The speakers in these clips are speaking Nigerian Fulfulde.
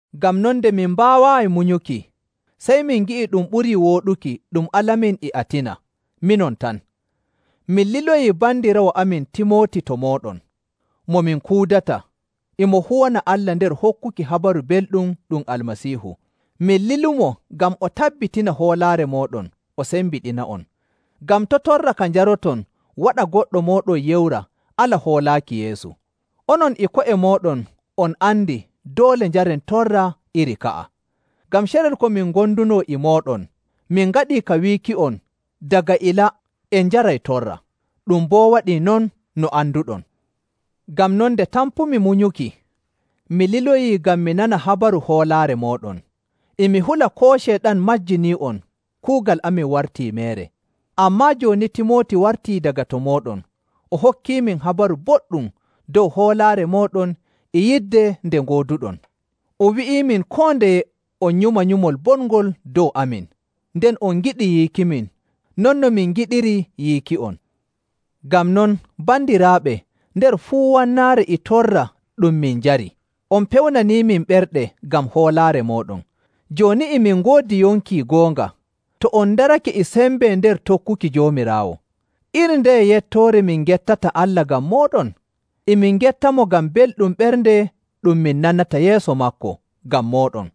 Ngam non nde min mbaawaayi munyuki, sey min ngi'i ɗum ɓurii wooɗuki ɗum alamin e Atina, minon tan. Min liloyi bandiraawo amin Timooti to mooɗon, mo min kuudata, e mo huwana Allah nder hokkuki Habaru Belɗum ɗum Almasiihu. Min lilumo ngam o tabbitina hoolaare mooɗon o sembiɗina'on, ngam to' torra ka njarɗon waɗa goɗɗo mooɗon yewra ala hoolaaki Yeesu. Onon e ko'e mooɗon on andi doole njaren torra iri ka'a. Ngam carel ko min ngondunoo e mooɗon, min ngaɗii ka wiiki'on daga ilaa en njaray torra. Ɗum boo waɗii non, no anduɗon. Ngam non, nde tampumi munyuki, mi liloyii ngam mi nana habaru hoolaare mooɗon. E mi hula koo Ceyɗan majjinii'on, kuugal amin wartii meere. Ammaa jooni Timooti wartii daga to mooɗon, o hokkiimin habaru boɗɗum dow hoolaare mooɗon e yidde nde ngooduɗon. O wi'iimin koo ndeye on nyuma nyumol bongol dow amin, nden on ngiɗi yiikimin non no min ngiɗiri yiiki'on. Ngam non, bandiraaɓe, nder fuu wannaare e torra ɗum min njari, on pewnaniimin ɓerɗe ngam hoolaare mooɗon. Jooni e min ngoodi yonki goonga, to on ndarake e sembe nder tokkuki Joomiraawo. Iri ndeye yettoore min ngettata Allah ngam mooɗon? E min ngettamo ngam belɗum ɓernde ɗum min nanata yeeso maako ngam mooɗon.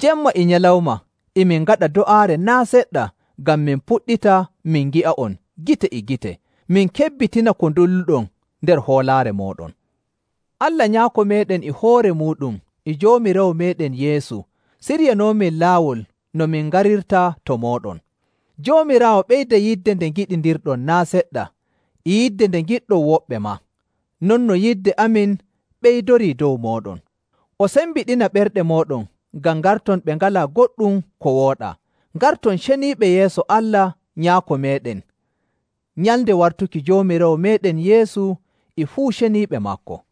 Jemma e nyalawma e min ngaɗa do'aare naa' seɗɗa ngam min puɗɗita min ngi'a'on gite e gite, min kebbitina ko ndulluɗon nder hoolaare mooɗon. Allah Nyaako meeɗen e hoore muuɗum e Joomiraawo meeɗen Yeesu siryanoomin laawol no min ngarirta to mooɗon. Joomiraawo ɓeyda yidde nde ngiɗindirɗon naa' seɗɗa e yidde nde ngiɗɗon woɓɓe maa, non no yidde amin ɓeydorii dow mooɗon. O sembiɗina ɓerɗe mooɗon ngam ngarton ɓe ngalaa goɗɗum ko wooɗaa, ngarton ceniiɓe yeeso Allah Nyaako meeɗen nyalnde wartuki Joomiraawo meeɗen Yeesu e fuu ceniiɓe maako.